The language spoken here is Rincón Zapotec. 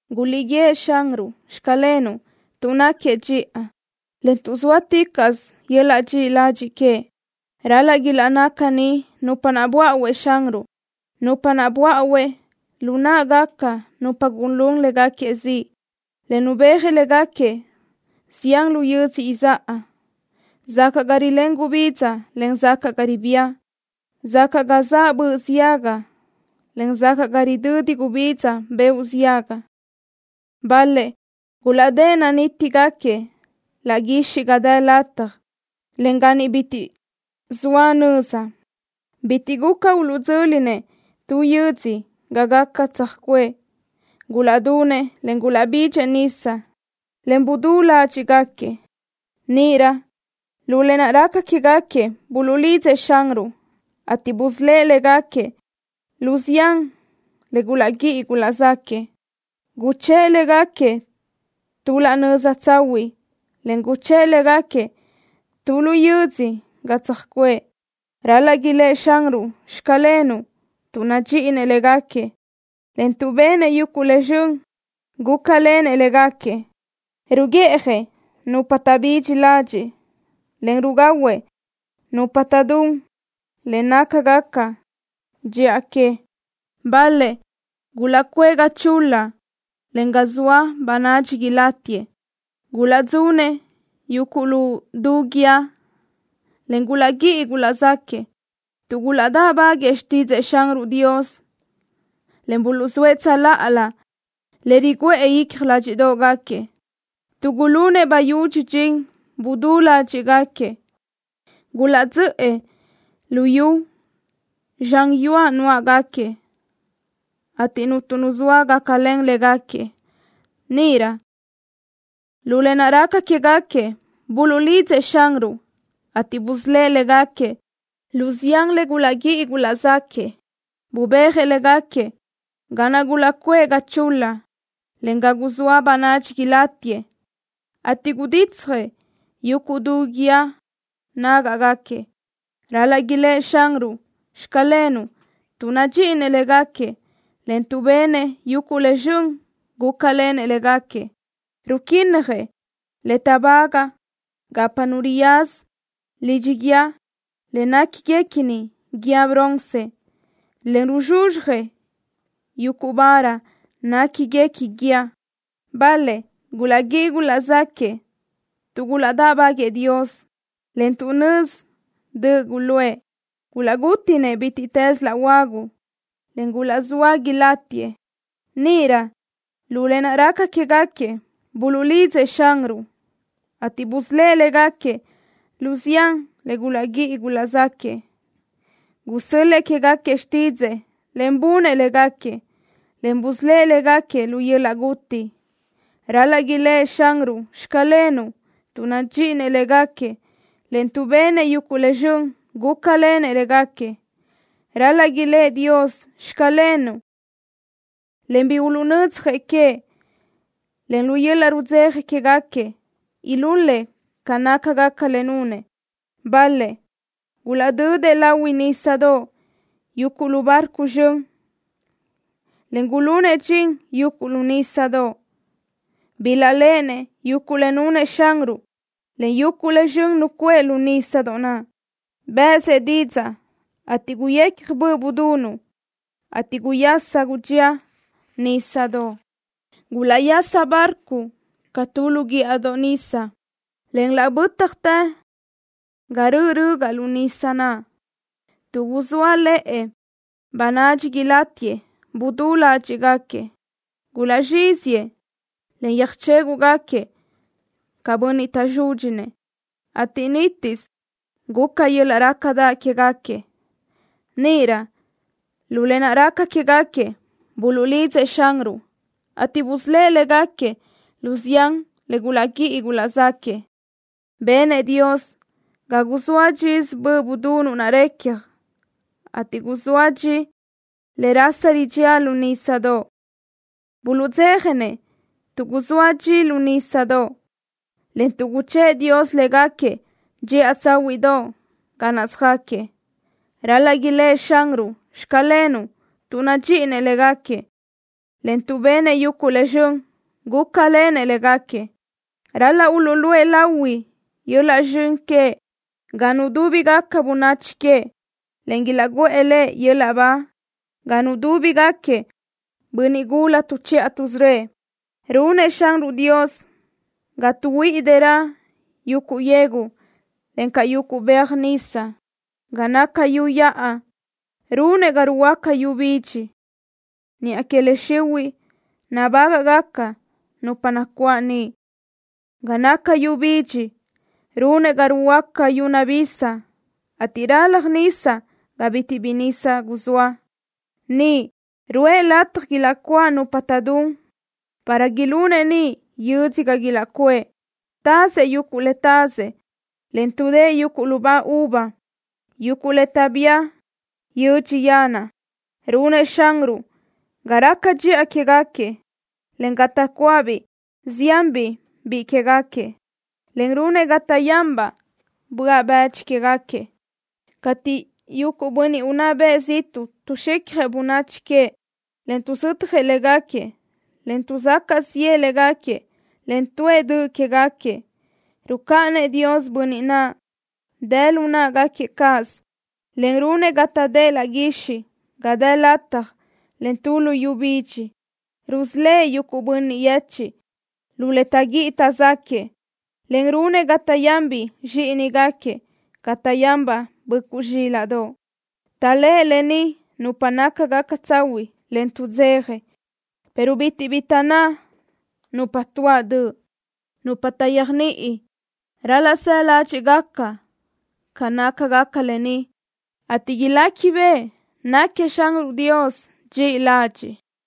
¡Guliʼguíëʼ Xanruʼ: “Xclenuʼ” tuʼ náquiëʼ dxiʼa, en tuʼ zóaticaʼsö yöl-laʼ dxiʼi ladxiʼ queëʼ! Ral-laʼ ilaʼnná caní nupa naʼ buáʼuëʼ Xanruʼ, nupa naʼ buáʼuëʼ lu náʼagaca nupa gulún léguequi ziʼ, en nubéajëʼ léguequi zián lu yödzö izáʼa, sacaʼ ga rilén gubidza, en sacaʼ ga ribía, sacaʼ ga zaʼ böʼ ziaga, en sacaʼ ga ridödi gubidza beoʼ ziaga. Bal-lëʼ gulaʼdë́ʼ nanítigaquiëʼ laʼ guixiʼ ga dë lataj, en ga niʼ bitiʼ zoa nöza. Bitiʼ guca uluʼdzö́linëʼ tu yödzö ga gaca tsöjcuʼë. Gulaʼdunëʼ, en gulaʼbidxëʼ nisa, en gudú ládxiʼgaquiëʼ. Níʼirö lu lë naʼ raca quégaquiëʼ buluʼlidzëʼ Xanruʼ, ateʼ busölë́ʼ légaquiëʼ lu zián le gulaʼguíʼi gulaʼzáquëʼë. Guchë́ʼë légaquiëʼ tu laʼ nöza tsahuiʼ, en guchë́ʼë légaquiëʼ tu lu yödzö ga tsöjcuʼë. Ral-laʼ ilë́ʼ Xanruʼ: “Xclenuʼ” tuʼ nadxíʼinëʼ légaquiëʼ, en tuʼ benëʼ yuguʼ le zxön, gúcalenëʼ légaquiëʼ. Ruguiʼjëʼ nupa taʼbidxi ladxiʼ, en rugahuëʼ nupa taʼdún le nácagaca dxiʼa queëʼ. Bal-lëʼ gulaʼcuʼë ga chul-la, en ga zoa bönadxi ilátiëʼ. Gulaʼdzunëʼ yuguʼ lu du guíë, en gulaʼguíʼi gulaʼzáquëʼë tuʼ gulaʼdáʼbaguëʼë xtídzëʼë Xanruʼ Dios, en buluʼzóëʼ tsöláʼalö le riguʼë icja ládxiʼdoʼgaquiëʼ. Tuʼ gulunëʼ bayúdx dxin, gudú ládxiʼgaquiëʼ. Gulaʼdzöʼë lu yu zxan yuaʼ nuáʼagaquiëʼ, ateʼ cuntu nu zoa gácalen légaquiëʼ. Níʼirö lu lë naʼ raca quégaquiëʼ buluʼlidzëʼ Xanruʼ, ateʼ busölë́ʼ légaquiëʼ lu zián le gulaʼguíʼi gulaʼzáquëʼë. Bubéajëʼ légaquiëʼ ga naʼ gulaʼcuʼë ga chul-la, en ga guzóa bönadxi ilátiëʼ, ateʼ guditsjëʼ yuguʼ du guíë núgaʼgaquiëʼ. Ral-laʼ ilë́ʼ Xanruʼ: “Xclenuʼ” tuʼ nadxíʼinëʼ légaquiëʼ, en tuʼ benëʼ yuguʼ le zxön, gúcalenëʼ légaquiëʼ. Ruquínnajëʼ le táʼbagaʼ gapa nu riyaza lidxi guíë le néquiniguequi guíë bronce, en ruzxuzxjëʼ yuguʼ vara néquiniguequi guíë. Bal-lëʼ gulaʼguíʼi gulaʼzáquëʼë tuʼ gulaʼdáʼbaguëʼë Dios, en tuʼ nözi döʼ guluʼë. Gulaʼgútiʼnëʼ bítiʼtës laʼ huagu, en gulaʼzóa ilátiëʼ. Níʼirö lu lë naʼ raca quégaquiëʼ buluʼlidzëʼ Xanruʼ, ateʼ busölë́ʼ légaquiëʼ lu zián le gulaʼguíʼi gulaʼzáquëʼë. Gusö́l-lëʼë quégaquiëʼ xtídzëʼë, en bunëʼ légaquiëʼ, en busölë́ʼ légaquiëʼ lu yöl-laʼ guti. Ral-laʼ ilë́ʼ Xanruʼ: “Xclenuʼ” tuʼ nadxíʼinëʼ légaquiëʼ, en tuʼ benëʼ yuguʼ le zxön, gúcalenëʼ légaquiëʼ. Ral-laʼ ilë́ʼ Dios: “Xclenuʼ”, en bi uluʼnödzjëʼ queëʼ, en lu yöl-laʼ rudzeja quégaquiëʼ ilul-lëʼ ca nácagaca le nunëʼ. Bal-lëʼ gulaʼdödëʼ lahui nísadoʼ yuguʼ lu barco zxön, en gulunëʼ dxin yuguʼ lu nísadoʼ. Bilaʼléʼenëʼ yuguʼ le nunëʼ Xanruʼ, en yuguʼ le zxön nucuʼë lu nísadoʼ. Bë́ʼësëʼ didzaʼ, ateʼ guyecja böʼ budunuʼ, ateʼ guyasa gudxía nísadoʼ. Gulaʼyasa barco ca tu lu guíʼadoʼ nisa, en laʼ bö́tjatë ga röʼö rögaʼ lu nisa naʼ. Tuʼ guzóale̲ʼe̲ bönadxi ilátiëʼ gudú ládxiʼgaquiëʼ. Gulaʼzxíziëʼ, en yöjchéguʼgaquiëʼ ca bönniʼ taʼzúdxinëʼ, ateʼ nítisö guca yöl-laʼ rácadaʼ quégaquiëʼ. Níʼirö lu lë naʼ raca quégaquiëʼ buluʼlidzëʼ Xanruʼ, ateʼ busölë́ʼ légaquiëʼ lu zián le gulaʼguíʼi gulaʼzáquëʼë. Benëʼ Dios ga guzóa dxisö böʼ budunuʼ naʼ recja, ateʼ guzóa dxi le rasa ridxía lu nísadoʼ. Buluʼdzéjanëʼ tuʼ guzóa dxi lu nísadoʼ, en tuʼ guchë́ʼë Dios légaquiëʼ dxiʼa tsáhuiʼdoʼ ga naʼ söjáquiëʼ. Ral-laʼ ilë́ʼ Xanruʼ: “Xclenuʼ” tuʼ nadxíʼinëʼ légaquiëʼ, en tuʼ benëʼ yuguʼ le zxön, gúcalenëʼ légaquiëʼ. Ral-laʼ uluʼluʼë lahui yöl-laʼ zxön queëʼ ga nudúbigaca bönachi queëʼ, en ilaʼguʼë Lëʼ yöl-laʼ ba ga nudúbigaquiëʼ bönniʼ gula tuʼchiʼa tuʼsörö́ëʼ. Runëʼ Xanruʼ Dios ga tuʼhuíʼi dërö yuguʼ yegu, encaʼ yuguʼ beaj nisa. Ga naca yu yaʼa runëʼ ga ruhuöáca yu bidxi, niʼa que le xihuiʼ nabágaʼgaca nupa nacuáʼ niʼ. Ga naca yu bidxi runëʼ ga ruhuöáca yu nabisa, ateʼ ralaj nisa ga bitiʼ bi nisa guzóa. Niʼ ruʼë lataj ilaʼcuáʼ nupa taʼdún para ilunëʼ niʼ yödzö ga ilaʼcuʼë. Tazëʼ yuguʼ le tazëʼ, en tuʼdë́ʼë yuguʼ lubá uva, yuguʼ le taʼbía yödxi yanaʼ. Runëʼ Xanruʼ ga raca dxiʼa quégaquiëʼ, en ga taʼcuáʼbiʼ ziánbiʼ biʼi quégaquiëʼ, en runëʼ ga taʼyanbaʼ böaʼ bëdxi quégaquiëʼ. Cateʼ yuguʼ bönniʼ unná bëʼ ziʼtuʼ tuʼzxicjëʼ bönachi queëʼ, en tuʼzötjëʼ léguequi, en tuʼsacaʼ ziʼë léguequi, en tuʼë döʼ quéguequi, rucáʼanëʼ Dios bönniʼ naʼ dë lu náʼagaquiëʼ cáʼasö, en runëʼ ga taʼdë́ʼ laʼ guixiʼ ga dë lataj, en tu luyú bidxi. Rusölë́ʼ yuguʼ bönniʼ yechiʼ lu le taʼguíʼi taʼzáquëʼë, en runëʼ ga taʼyanbiʼ zxíʼinigaquiëʼ ca taʼyánbaʼ böʼcuʼ zxílaʼdoʼ. Taʼléʼe lë ni nupa nácagaca tsahuiʼ, en tuʼdzeja, pero bitiʼ bi taʼnná nupa tuáʼ döʼ. Nupa taʼyéajniʼi ral-laʼ saʼ ládxiʼgaca ca nácagaca lë ni, ateʼ iléquibeʼe náquiëʼ Xanruʼ Dios dxiʼi ladxiʼ.